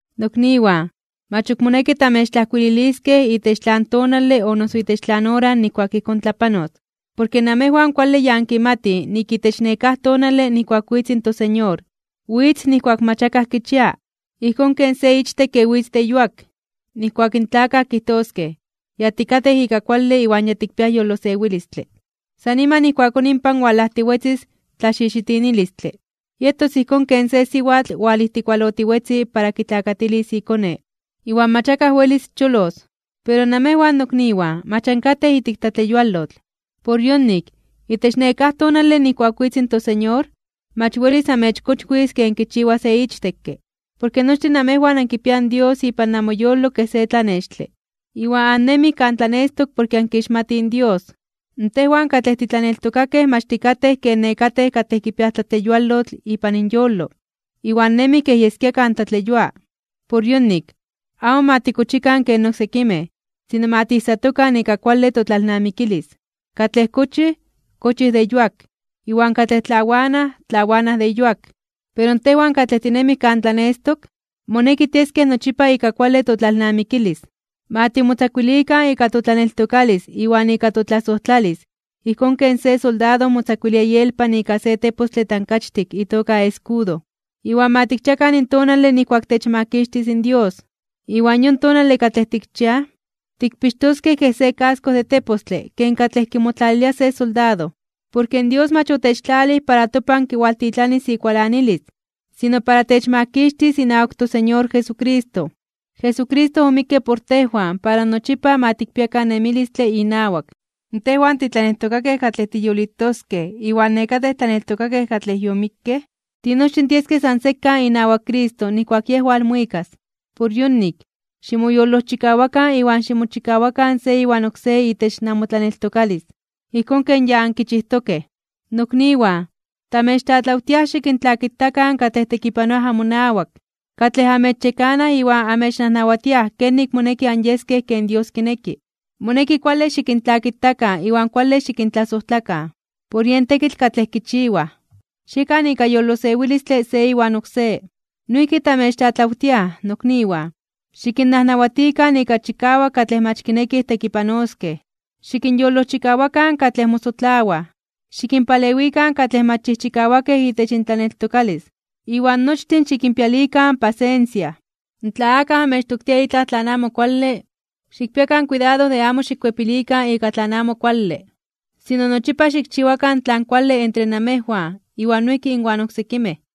Nokniwan, mach moneki tamechijkuililiskej itech tlan tonale o noso itech tlan ora nijkuak ijkón tlapanos. Porke namejwan kuale ya ankimatij nik itech nekáj tonale nijkuak witz in toSeñor, witz nijkuak mach akaj kichia, ijkón ken se ichtekke witz de yuak. Nijkuak in tlakaj kijtoskej: “Ya tikatej ika kuale iwan ya tikpiaj yolosewilistle”, san niman ijkuakón inpan walajtiwetzis tlaxixitinilistle. Yetos ijkón ken se siwatl walijtikualotiwetzi para kitlakatilis ikone. Iwan mach akaj welis cholos. Pero namejwan, nokniwan, mach ankatej ijtik tlatleyualotl. Por yonik, itech nekáj tonale nijkuak witz in toSeñor, mach welis amechkochwis (amechsorprenderos) ken kichiwa se ichtekke. Porke nochtin namejwan ankipiaj in Dios ipan namoyolo kej se tlanextle, iwan annemij kan tlanestok porke ankixmatij in Dios. Tejwan katlej titlaneltokakej mach tikatej ken nekatej katlej kipiaj tlatleyualotl ipan inyolo, iwan nemij kej yeskia kan tlatleyua. Por yonik, amo ma tikochikan ken oksekimej, sino ma tijsatokan ika kuale totlalnamikilis. Katlej kochij, kochij de yuak, iwan katlej tlawanaj, tlawanaj de yuak. Pero tejwan katlej tinemij kan tlanestok, moneki tieskej nochipa ika kuale totlalnamikilis. Ma timotzakuilikan ika totlaneltokalis iwan ika totlasojtlalis ijkón ken se soldado motzakuilia ielpan ika se tepostle tankachtik itoka escudo. Iwan ma tikchiakan in tonale nijkuak techmakixtis in Dios, iwan yon tonale katlej tikchiaj, tikpixtoskej kej se casco de tepostle ken katlej kimotlalilia se soldado. Porke Dios mach otechtlalij para topan kiwaltitlanis ikualanilis, sino para techmakixtis inawak in toSeñor Jesucristo. Jesucristo omikke por tejwan para nochipa ma tikpiakan nemilistle inawak. Tejwan titlaneltokakej katlej tiyolitoskej iwan nekatej tlaneltokakej katlej yomikkej, tinochtin tieskej san sekan inawak Cristo nijkuak Yej walmuikas. Por yonik, ximoyolojchikawakan iwan ximochikawakan se iwan oksé itech namotlaneltokalis, ijkón ken ya ankichijtokej. Nokniwan, tamechtlatlawtiaj xikintlakitakan katlej tekipanoaj amonawak, katlej amechyekanaj iwan amechnajnawatiaj kenik moneki anyeskej ken Dios kineki. Moneki kuale xikintlakitakan iwan kuale xikintlasojtlakan, por yen tekitl katlej kichiwaj. Xiekan ika yolosewilistle se iwan oksé. Noijki tamechtlatlawtiaj, nokniwan, xikinnajnawatikan ika chikawak katlej mach kinekij tekipanoskej, xikinyolojchikawakan katlej mosotlawaj, xikinpalewikan katlej mach chijchikawakej itech intlaneltokalis, iwan nochtin xikinpialikan pasensia. Tla akaj amechtoktia itlaj amo kuale, xikpiakan kuidado de amo xikkuepilikan ika tlan amo kuale, sino nochipa xikchiwakan tlan kuale entre namejwan iwan noijki inwan oksekimej.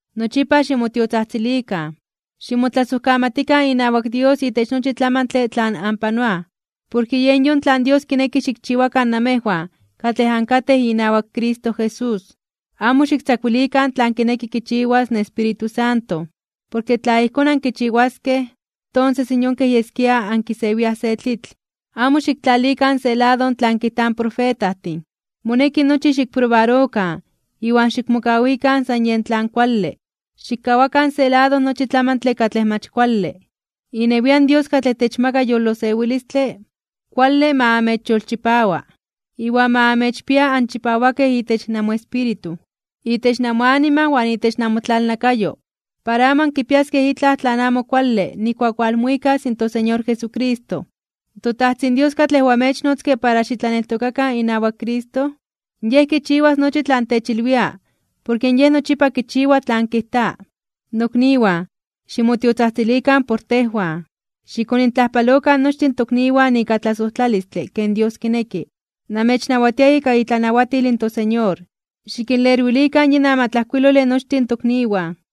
Nochipa ximotiotzajtzilikan. Ximotlasojkamatikan inawak Dios itech nochi tlamantle tlan anpanoaj, porke yen yon tlan Dios kineki xikchiwakan namejwan katlej ankatej inawak Cristo Jesús. Amo xiktzakuilikan tlan kineki kichiwas in Espíritu Santo, porke tla ijkón ankichiwaskej, tonses yon kej yeskia ankisewiaj se tlitl. Amo xiktlalikan se lado tlan kijtaj in profetajtin. Moneki nochi xikprobarokan, iwan xikmokawikan san yen tlan kuale. Xikkawakan se lado nochi tlamantle katlej mach kuale. Inewian Dios katlej techmaka yolosewilistle, kuale ma amechyolchipawa. Iwan ma amechpia anchipawakej itech namoespíritu, itech namoanima iwan itech namotlalnakayo, para amo ankipiaskej itlaj tlan amo kuale nijkuak walmuikas in toSeñor Jesucristo. ToTajtzin Dios katlej oamechnotzke para xitlaneltokakan inawak Cristo, Yej kichiwas nochi tlan techilwia porke Yej nochipa kichiwa tlan kijta. Nokniwan, ximotiotzajtzilikan por tejwan. Xikonintlajpalokan nochtin tokniwan ika tlasojtlalistle ken Dios kineki. Namechnawatia ika itlanawatil toSeñor, xikinlerwilikan yin amatlajkuilole nochtin tokniwan.